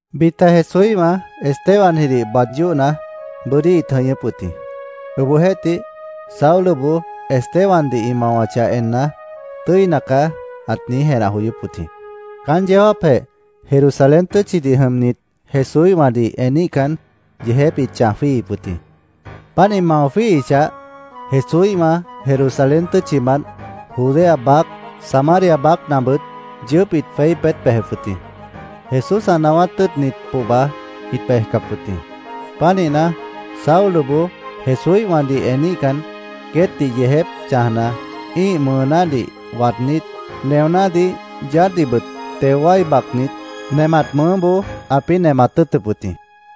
Bita Jesúíhwã Estebanjidih baad yóhna, bʉ́dí ĩt jʉñʉ́p wʉt jĩ. Obohjeéhtih, Sauloboó Estebandih ĩ mawachah enna, “Tʉ́ina caá”, ãt niíj jenah joyóp wʉt jĩ. Caán yeó jáapjeh Jerusalén tʉ́tchidih jʉmnit Jesúíhwãdih eníhcan, yeejép ĩt chãj jwíihip wʉt jĩ. Páant ĩ mao jwíihichah, Jesúíhwã Jerusalén tʉ́tchimant Judea baác, Samaria baácnabʉt yʉʉ́p ĩt jweí peét bejep wʉt jĩ. Jesús ã naáwát tʉ́ʉtnit pohba ĩt bejcap wʉt jĩ. Pánihna, Sauloboó Jesúíhwãdih eníhcan, queétdih yeejép chãjna, ĩ́ih mʉʉnádih waadnít, neonádih, yaádhdihbʉt teo wái bacnit, nemat mʉʉ́boó ãpĩ́ nemat tʉ́ʉtʉp wʉt jĩ.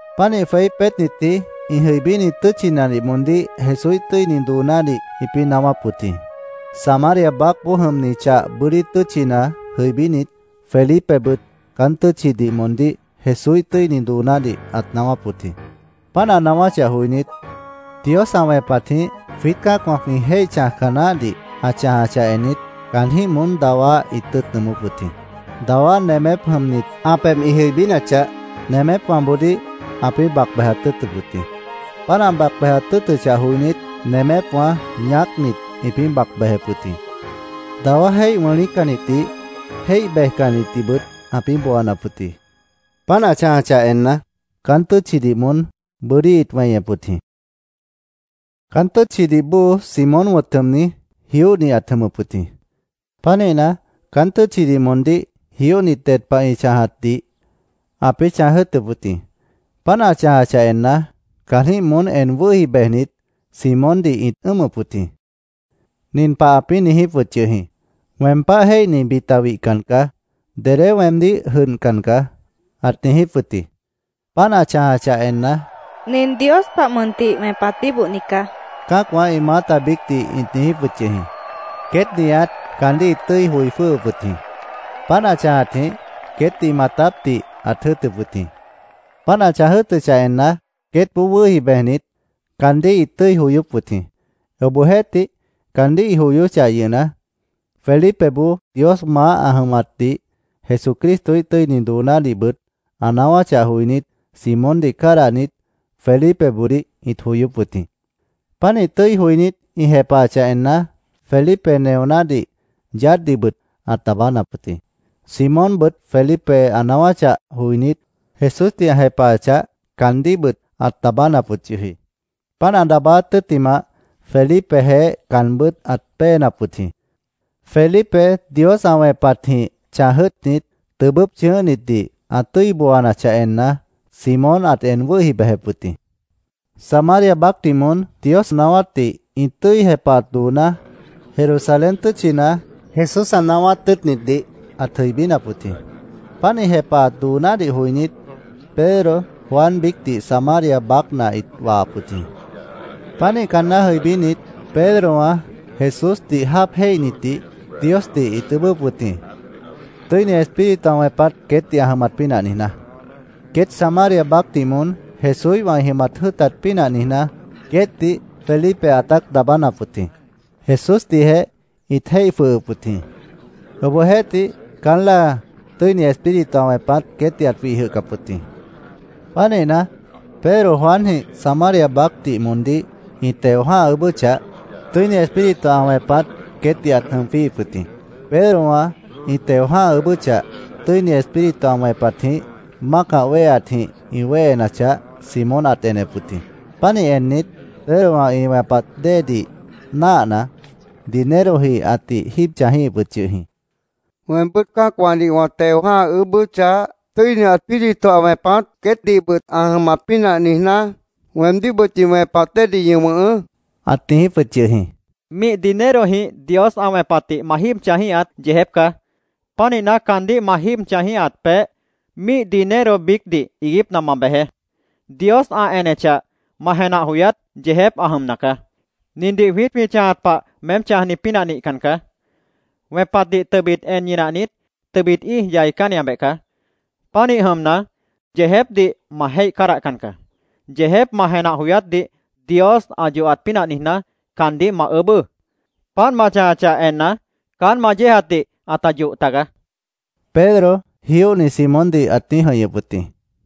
Pánih jweí peétnitji ĩ jʉibíni tʉ́tchinadih moondíh Jesúíh tʉ́ini doonádih ĩpĩ́ naáwáp wʉt jĩ. Samaria baácboó jʉmni chah bʉ́dí tʉ́tchina jʉibínit, Felipebʉt caán tʉ́tchidih moondíh Jesúíh tʉ́ini doonádih ãt naáwáp wʉt jĩ. Páant ã naáwáchah joinít, Dios ã wẽpatjĩh jwiít cã́acwã jwĩ jéih chãjca naáhdih ã chãjachah ennit, caanjĩ́h moón dawá ĩt tʉ́i joyóp wʉt jĩ. Dawá nemép jʉmnit ã pebh ĩ jʉibínachah, nemépwãboodíh ãpĩ́ bac bejat tʉ́ʉtʉp wʉt jĩ. Páant ã bac bejat tʉ́ʉtʉchah joinít, nemépwã ñaácnit, ĩpĩ́ bac bejep wʉt jĩ. Dawá jéih wʉ̃lícannitdih, jéih bejcannitdihbʉt ãpĩ́ booanap wʉt jĩ. Páant ã chãjachah enna, caán tʉ́tchidih moón bʉ́dí ĩt weñep wʉt jĩ. Caán tʉ́tchidih bóo Simón wʉ̃t jʉmni, jióhni ãt jʉmʉp wʉt jĩ. Pánihna, caán tʉ́tchidih moondíh jióhnit ded pah ĩ chãjatdih ãpĩ́ chãj jʉ́ʉtʉp wʉt jĩ. Páant ã chãjachah enna, caanjĩ́h moón en wʉ́hi bejnit, Simóndih ĩt ʉ́ʉmʉp wʉt jĩ. Nin pah ãpĩ́ niijíp wʉt yʉh jĩ: “Weem páh jéihni bita wihcan caá. Dedé weemdíh jʉdhcan caá”, ãt niijíp wʉt jĩ. Páant ã chãjachah enna, “Nin Dios pah mʉntih wẽpat bíbohni caá”, cã́acwã ĩ maáta biícdih ĩt niijíp wʉt yʉh jĩ. Queét nihat caandíh ĩt tʉ́i joi jwʉ́hʉp wʉt jĩ. Páant ã chãjatjĩh queétdih maatápdih ãt jʉ́ʉtʉp wʉt jĩ. Páant ã chãj jʉ́ʉtʉchah enna, queétboó wʉ́hi bejnit, caandíh ĩt tʉ́i joyóp wʉt jĩ. Obohjeéhtih, caandíh ĩ joyóchah yʉhna, Felipeboó Dios maáh ã jʉmatdih, Jesucristoíh tʉ́ini doonádihbʉt ã naáwáchah joinít, Simóndih cádahnit, Felipeboodíh ĩt joyóp wʉt jĩ. Pánih tʉ́i joinít, ĩ jepahachah enna, Felipe neonádih, yaádhdihbʉt ãt daabánap wʉt jĩ. Simónbʉt Felipe ã naáwáchah joinít, Jesúsdih ã jepahachah, caandíhbʉt ãt daabánap wʉt yʉh jĩ. Páant ã daabáát tʉ́ttimah, Felipejeéh caanbʉ́t ãt péenap wʉt jĩ. Felipe Dios ã wẽpatjĩh chãj jʉ́ʉtnit, tʉbʉ́p chʉ̃ʉ́hnitdih ã tʉ́i booanachah enna, Simón ãt en wʉ́hi bejep wʉt jĩ. Samaria baácdih moón Dios naáwátdih ĩ tʉ́i jepahat dooná Jerusalén tʉ́tchina Jesús ã naáwát tʉ́ʉtnitdih ãt jʉibínap wʉt jĩ. Páant ĩ jepahat doonádih joinít, Pedro, Juan biícdih, Samaria baácna ĩt wahap wʉt jĩ. Pánih caanná jʉibínit, Pedrowã Jesúsdih jáap jéihnitdih Diosdih ĩt ʉʉ́bʉ́p wʉt jĩ, Tʉ́ini Espíritu ã wẽpat queétdih ã jʉmat pínah niijná. Queét Samaria baácdih moón Jesúíhwã ĩ jʉmat jʉ́ʉtat pínah niijná, queétdih Felipe ãtát daabánap wʉt jĩ. Jesúsdihjeh ĩt jéih jwʉhʉp wʉt jĩ. Obohjeéhtih, caán láa, Tʉ́ini Espíritu ã wẽpat queétdih ãt wih jwʉhcap wʉt jĩ. Pánihna, Pedro Juanjĩh Samaria baácdih moondíh ĩ teo jã́ha ʉʉ́bʉ́chah, Tʉ́ini Espíritu ã wẽpat queétdih ãt jʉm jwíihip wʉt jĩ. Pedrowã ĩ teo jã́ha ʉʉ́bʉ́chah, Tʉ́ini Espíritu ã wẽpatjĩh mácah wéheatjĩh ĩ wéhenachah, Simón ãt enep wʉt jĩ. Pánih ennit, Pedrowã ĩ wẽpat déedih náahna, dinerojĩh ãtih jíib chãjíhip wʉt yʉh jĩ. —Weembʉ́t cã́acwãdih wã teo jã́ha ʉʉ́bʉ́chah, Tʉ́ini Espíritu ã wẽpat queétdihbʉt ã jʉmat pínah niijná, weemdíhbʉt ñi wẽpat déedih ñi wʉ̃hʉʉ́, ãt niijíp wʉt yʉh jĩ. —Míih dinerojĩh Dios ã wẽpatdih ma jíib chãjíhat yeejép caá. Pánihna, caandíh ma jíib chãjíhat peéh míih dinero biícdih iiguípna ma bejeé. Dios ã enechah, ma jenah joyát yeejép ã jʉmna caá. Nindih jwiít jwĩ chãjat pah meém chãjni pínah nihcan caá. Wẽpatdih tʉbit en ñinahnit, tʉbit íij yaicánniabeh caá. Pánih jʉmna, yeejépdih ma jéih cádahcan caá. Yeejép ma jenah joyátdih Dios ã yohat pínah niijná, caandíh ma ʉʉ́bʉ́. Páant ma chãjachah enna, caán ma yéejatdih ãta yoh tagaá, Pedro jióhni Simóndih ãt niíj jʉ̃ihñʉp wʉt jĩ.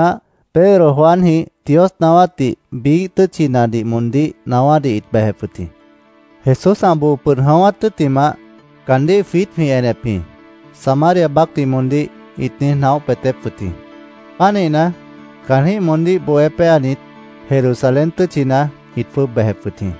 Tʉ́ttimah, Pedro Juanjĩh Dios naáwátdih biíh tʉ́tchinadih moondíh naáwádih ĩt bejep wʉt jĩ. “Jesús ã boo pʉd jʉ̃ʉ́wát tʉ́ttimah, caandíh jwiít jwĩ enep jĩ”, Samaria baácdih moondíh ĩt niíj naóh peetép wʉt jĩ. Pánihna, caanjĩ́h moondíh bohé péanit, Jerusalén tʉ́tchina ĩt jwʉ́ʉb bejep wʉt jĩ.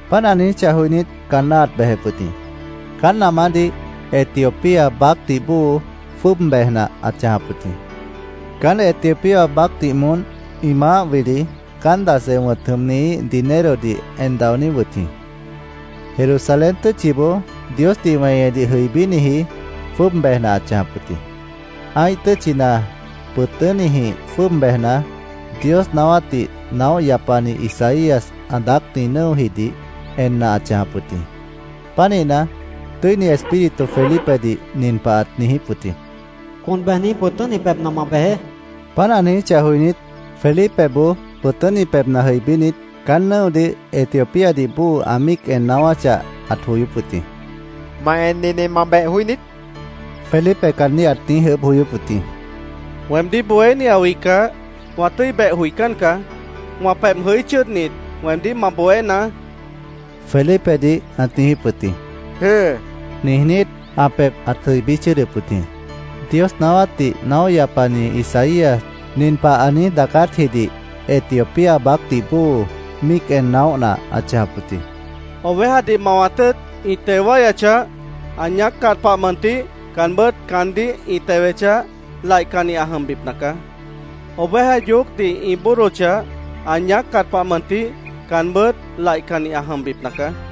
Páant ã niijíchah joinít, caanná ãt bejep wʉt jĩ. Caán namádih Etiopía baácdih bóo jwʉ́ʉb bejna ãt chãjap wʉt jĩ. Caán Etiopía baácdih moón ĩ maáh wili Candace wʉ̃t jʉmnihíh dinerodih en daoní wʉt jĩ. Jerusalén tʉ́tchiboó Diosdih weñedih jʉibíniji jwʉ́ʉb bejna ãt chãjap wʉt jĩ. Ã́ih tʉ́tchina pʉ̃tʉ́nijĩh jwʉ́ʉb bejna, Dios naáwátdih naóh yapani Isaías ã daácni nʉ́ojidih enna ãt chãjap wʉt jĩ. Pánihna, Tʉ́ini Espíritu Felipedih nin pah ãt niijíp wʉt jĩ: “Con bejni pʉ̃tʉ́ni pebhna ma bejeé”, ãt niijíp wʉt jĩ. Páant ã niijíchah joinít, Felipeboó pʉ̃tʉ́ni pebhna jʉibínit, caán nʉ́odih Etiopíadih bóo ã míic en naáwáchah, ãt joyóp wʉt jĩ. —¿Ma ennidih ma beh joí niít? Felipe caandíh ãt niíj ʉʉ́bh joyóp wʉt jĩ. —Weemdíh bohéni ã wihcah, wã tʉ́i beh joicán caá. Wã pebh jʉí chʉ́ʉdnit, weemdíh ma bohénaá, Felipedih ãt niijíp wʉt jĩ. —Jʉ́ʉ, niijnít, ã pebh ãt jʉibí chʉ́ʉdʉp wʉt jĩ. Dios naáwátdih naóh yapani Isaías nin pah ã niíj daacátjidih Etiopía baácdih bóo míic en naóhna ãt chãjap wʉt jĩ: “Ovejadih mawat tʉ́ʉt, ĩ teo wáyachah, ã ñaáccat pah mʉntih caanbʉ́t caandíh ĩ tewechah, laihcanni ã jʉmbipna caá. Oveja yoócdih ĩ bóodochah, ã ñaáccat pah mʉntih caanbʉ́t laihcanni ã jʉmbipna caá.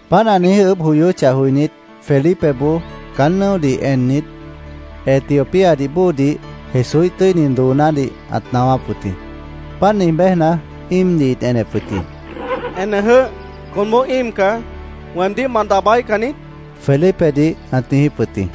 Páant ã niíj ʉʉ́bh joyóchah joinít, Felipeboó caán nʉ́odih ennit, Etiopíadih bóodih Jesúíh tʉ́ini doonádih ãt naáwáp wʉt jĩ. Páant niij béjna, íimdih ĩt enep wʉt jĩ. —¡Enejʉ́h! Conboó íim caá. ¿Weemdíh ma daabáíhcan niít? Felipedih ãt niijíp wʉt jĩ.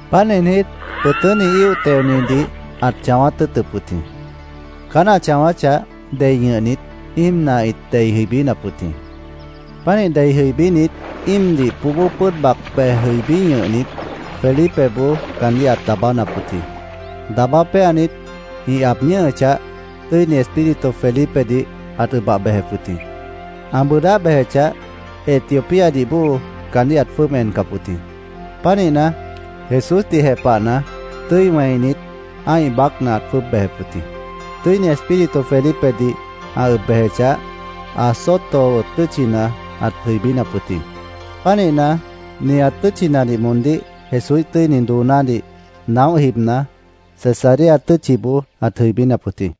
Páant niijnít, pʉ̃tʉ́ni íoh teonidih ãt chãwáát tʉ́ʉtʉp wʉt jĩ. Caán ã chãwáchah, dei ñʉhnit, íimna ĩt dei jʉibínap wʉt jĩ. Pánih dei jʉibínit, íimdih póbó pʉ́ʉd bac bej jʉibí ñʉhnit, Felipeboó caandíh ãt daabánap wʉt jĩ. Daabá péanit, ĩ aab ñʉ́hʉchah, Tʉ́ini Espíritu Felipedih ãt ʉbah bejep wʉt jĩ. Ã bʉʉdáh bejechah, Etiopíadih bóo caandíh ãt jwʉ́ʉb encap wʉt jĩ. Pánihna, Jesúsdih jepahna, tʉ́i wẽinit, ã́ih baácna ãt jwʉ́ʉb bejep wʉt jĩ. Tʉ́ini Espíritu Felipedih ã ʉb bejechah, Azoto tʉ́tchina ãt jʉibínap wʉt jĩ. Pánihna, nihat tʉ́tchinadih moondíh Jesúíh tʉ́ini doonádih naóh jibna, Cesarea tʉ́tchiboó ãt jʉibínap wʉt jĩ.